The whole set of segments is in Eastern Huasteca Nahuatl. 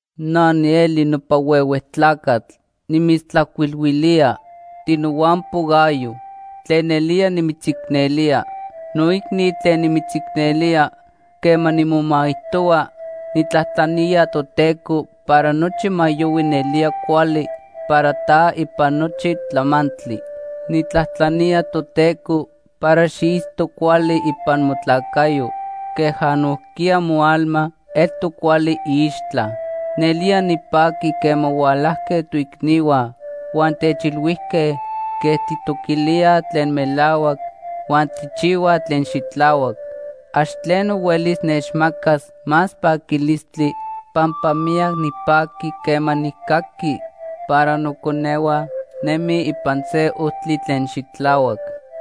Na nieli nopa huehue tlacatl nimitztlajcuilhuilía, tinohuampo Gayo, tlen nelía nimitzicnelía. Noicni tlen nimitzicnelía, quema nimomaijtohua, nijtlajtlanía Toteco para nochi ma yohui nelía cuali para ta ipan nochi tlamantli. Nijtlajtlanía Toteco para xiitzto cuali ipan motlacayo queja nojquiya moalma eltoc cuali iixtla. Nelía nipajqui quema hualajque toicnihua huan techilhuijque quej tijtoquilía tlen melahuac huan tijchihua tlen xitlahuac. Ax tleno huelis nechmacas más paquilistli, pampa miyac nipaqui quema nijcaqui para noconehua nemij ipan se ojtli tlen xitlahuac.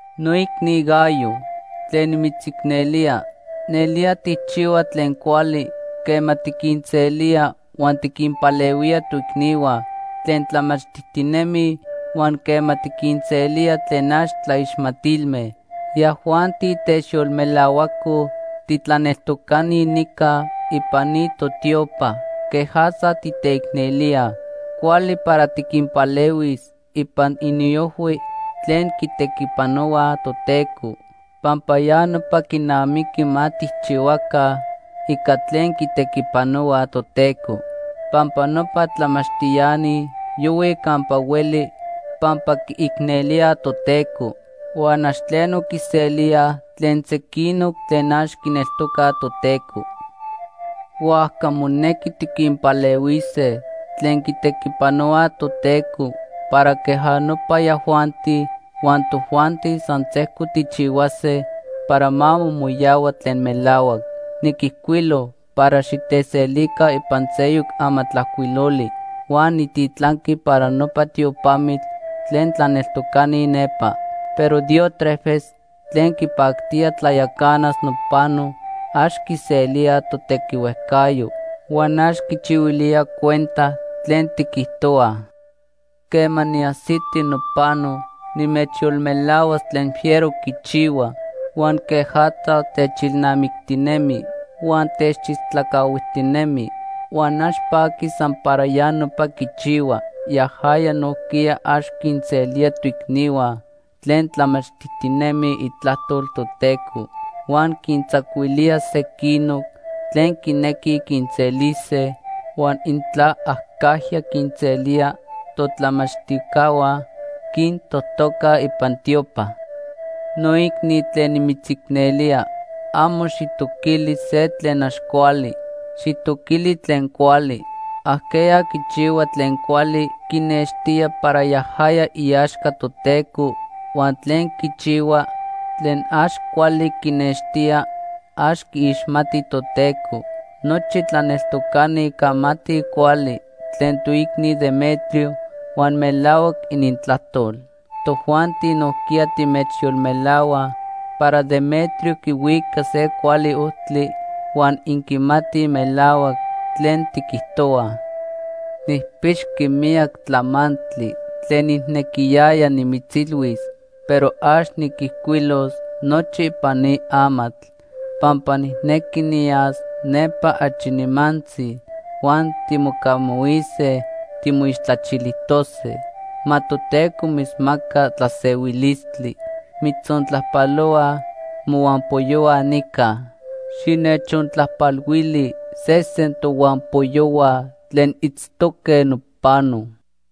Noicni Gayo tlen nimitzicnelía, nelía tijchihua tlen cuali quema tiquinselía huan tiquinpalehuía toicnihua tlen tlamachtijtinemij, huan quema tiquinselía tlen ax tlaixmatilme. Yajuanti techyolmelahuacoj titlaneltocani nica ipan ni totiopa quejatza titeicnelía. Cuali para tiquinpalehuis ipan iniojhui tlen quitequipanohuaj Toteco, pampa ya nopa quinamiqui ma tijchihuaca ica tlen quitequipanohuaj Toteco. Pampa nopa tlamachtiani yohuij campa hueli pampa quiicnelíaj Toteco. Huan ax tleno quiselíaj tlen sequinoc tlen ax quineltocaj Toteco. Huajca monequi tiquinpalehuise tlen quitequipanohuaj Toteco para queja nopa yajuanti huan tojuanti san sejco tijchihuase para ma momoyahua tlen melahuac. Niquijcuilo para xiteselica ipan seyoc amatlajcuiloli huan nijtitlanqui para nopa tiopamitl tlen tlaneltocani nepa. Pero Diótrefes tlen quipactía tlayacanas nopano, ax quiselía totequihuejcayo huan ax quichihuilía cuenta tlen tiquijtohuaj. Quema niajsiti nopano, nimechyolmelahuas tlen fiero quichihua, huan quejatza techilnamictinemi huan techistlacahuijtinemi. Huan ax paqui san para ya nopa quichihua, yajaya nojquiya ax quinselía toicnihua tlen tlamachtijtinemij itlajtol Toteco. Huan quintzacuilía sequinoc tlen quinequij quinselise, huan intla acajya quinselía totlamachtijcahua, quintojtoca ipan tiopa. Noicni tlen nimitzicnelía, amo xijtoquili se tlen ax cuali. Xijtoquili tlen cuali. Ajqueya quichihua tlen cuali quinextía para yajaya iaxca Toteco, huan tlen quichihuaj tlen ax cuali quinextíaj ax quiixmatij Toteco. Nochi tlaneltocani camatij cuali tlen toicni Demetrio huan melahuac inintlajtol. Tojuanti nojquiya timechyolmelahuaj para Demetrio quihuica se cuali ojtli huan inquimatij melahuac tlen tiquijtohuaj. Nijpixqui miyac tlamantli tlen nijnequiyaya nimitzilhuis, pero ax niquijcuilos nochi ipan ni amatl. Pampa nijnequi niyas nepa achi nimantzi huan timocamahuise timoixtlachilijtose. Ma Toteco mitzmaca tlasehuilistli. Mitzontlajpalohuaj mohuampoyohua nica. Xinechontlajpalhuili sesen tohuampoyohua tlen itztoque nopano.